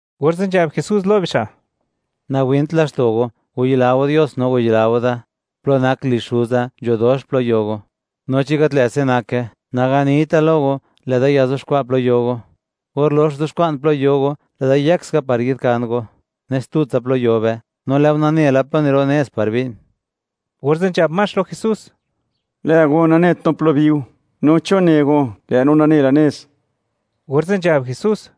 Orze' nzhab Jesús lo bixa': ―Nawint laxto' go; wayila go Dios no wayila go da. Plo nak lizh Xuza, nzho dox plo yo go, no chi gat lë' se' nake, naganita lo go; lë'da yazuxkwa' plo yo go. Or lox zu'xkwa'n plo yo go, lë'da yëk ska par yi'dkan go, nes tutsa plo yo be. No lë' go nane la plo niro' nez par bi'n. Orze' nzhab Max lo Jesús: ―Lë' go, nanet no plo biu; no, ¿chon ne go, lë' no nane la nez? Orze' nzhab Jesús: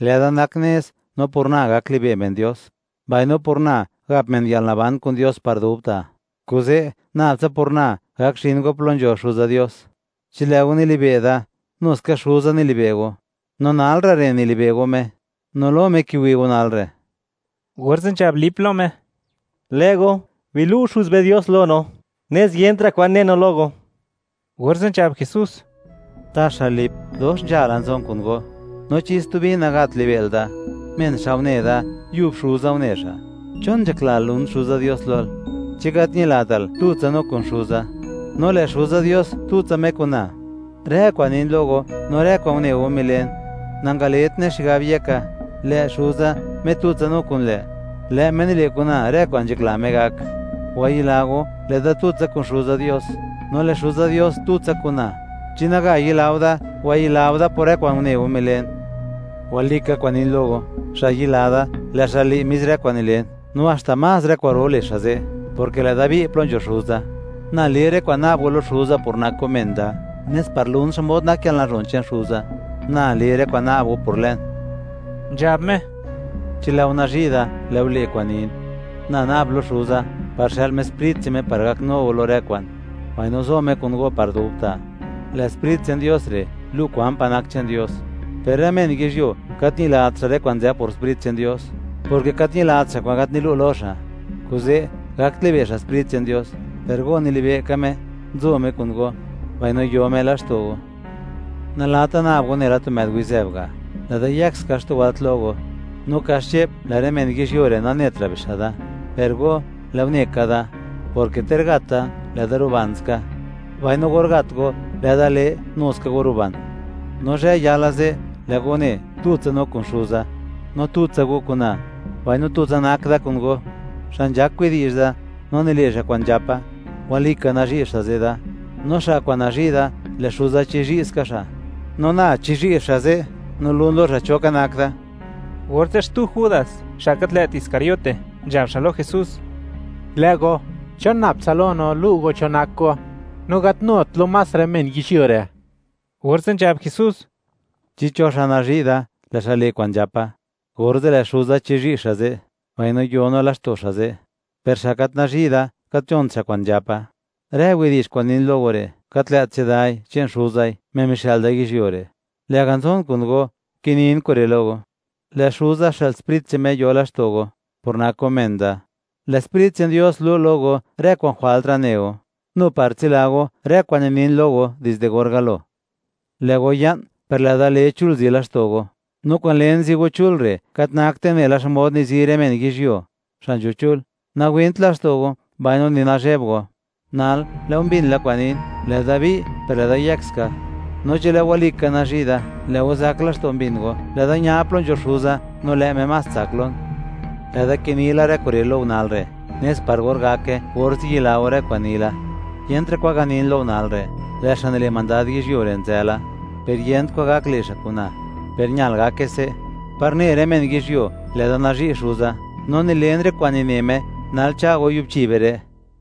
―Lë'da nak nez, no por na gak libe' men Dios, mbaino por na, gap men yalnaban kun Dios par dubta'; kuze' nab tsa por na gak zhin go plo nzho Xuza Dios. Chi lë' go nilibe' da, nu ska Xuza nili'be' go; no nal ra' re' nili'be' go Me, no lo Me kiwi' go nal re'. Orze' nzhab Lip lo Me: ―Lë' go, bilu'o Xuz be Dios lo no; nes yentra' kwan ne no lo go. Orze' nzhab Jesús: ―¿Taxa Lip, dox nzhala nzon kun go?, no, ¿chi stubi nagat li'be'l da? Men xa' une da, yub Xuza une xa'. ¿Chon nzhaklal, lun Xuza Dios lol? ¿Chi gat ñilatal, tutsa no kun Xuza, no lë' Xuza Dios tutsa Me kun na? Rë kwa'n nin lo go, no rë kwa'n une go milen, nangaletne xigab yeka; lë' Xuza, Me tutsa no kun lë', lë' Me nile' kun na rë kwa'n nzhakla Me gak. Wayila go, lë'da tutsa kun Xuza Dios, no lë' Xuza Dios tutsa kun na; chi naga yila go da, wayila go da por rë kwa'n une go, milen. Walika kwa'n nin lo go, xa' yila da, lë' xa' le' mis rë kwa'n nilen; no haxta más rë kwa'ro le' xa' ze', porke lë'da bi' plo nzho Xuza. Na le rë kwa'n na'b go lo Xuza por nak go men da, nes par lun xmod nak yalnazhon che'n Xuza. Na le rë kwa'n na'b go por lën. Nzhab Me: ―Chi lë'o nazhi' da, lë'o le' kwa'n nin. Na na'b lo Xuza, par xë'l Me Sprit che'n Me par gaknu go lo rë kwa'n, mbaino zo Me kun go par dubta'. Lë' Sprit che'n Dios re' lu' kwan pa' nak che'n Dios. Per rë men yizhyuo, gat ñilat xa' rë kwa'n nzë por Sprit che'n Dios, porke gat ñilat xa' kwa'n gat nilu' lo xa', kuze' gakt libe' xa' Sprit che'n Dios. Per go, nilibe' ka Me, nzo Me kun go, mbaino yo Me laxto' go. Nalata nab go nela tu më'd wizëb ga', lë'da yëk ska xtu wëlt lo go. No kaxche'p, lë' rë men yizhyuo re', nanetra' bixa' da; per go, lë' go ne ka da, porke ter gat da, lë'da ruban ska; mbaino or gat go, lë'da le, nu ska go ruban. No zhë yala ze', lë' go ne, tutsa no kun Xuza; no tutsa go kun na, mbaino tutsa nak da kun go. Xa' nzhak widi'zh da, no nile' xa' kwa'n nzhapa, walika nazhi' xa' ze' da; no xa' kwa'n nazhi' da, lë' Xuza chizhi' ska xa', no na chizhi' xa' ze', no lun lo xa' cho ka nak da. Orze' xtu Judas (xa' gat lë't Iscariote) nzhab xa' lo Jesús: ―Lë' go, ¿chon nab tsa lo no, lu' go cho nak go, no gat nut lo más rë men yizhyuo re'? Orze' nzhab Jesús: ―Chi cho xa' nazhi' da, lë' xa' le' kwa'n nzhapa, orze' lë' Xuza chizhi' xa' ze', mbaino yo no laxto' xa' ze'. Per xa' gat nazhi' da, gat nzhont xa' kwa'n nzhapa. Rë widi'zh kwa'n nin lo go re', gat lë't chedai, che'n Xuzai, Me mixë'l da yizhyuo re'. Lë'ga' nzon kun go, kinin kure' lo go. Lë' Xuza xë'l Sprit che'n Me yo laxto' go, por nak go men da; lë' Sprit che'n Dios lu' lo go rë kwa'n jwaltra' ne go, nu par tsila go rë kwa'n ninin lo go dizde or galo. Lë' go ya'n, per lë'da le chul zi laxto' go; no kwa'n len zi go chul re' gat nakte nela xmod nizi rë men yizhyuo, xa' nzho chul. Nawint laxto' go, mbaino ni nazheb go. Nal, lë' go mbin la kwa'n nin, lë'da bi', per lë'da yëk ska. No chi lë' go walika nazhi' da, lë' go zak laxto' mbin go, lë'da ña plo nzho Xuza, no lë' Me más tsak lon. Lë'da kini la rë kure' lo go nal re', nes par or gake, orze' yila go rë kwa'n ni la. Yentra' kwan ganin lo go nal re', lë' xa' nile' mandad yizhyuo re' nzë la, per yent kwan gak le' xa' kun na. Per ñal ka gake se', par ne rë men yizhyuo, lë'da nazhi' Xuza no nilen rë kwa'n nine Me. Nal cha' go, yubchi be re'.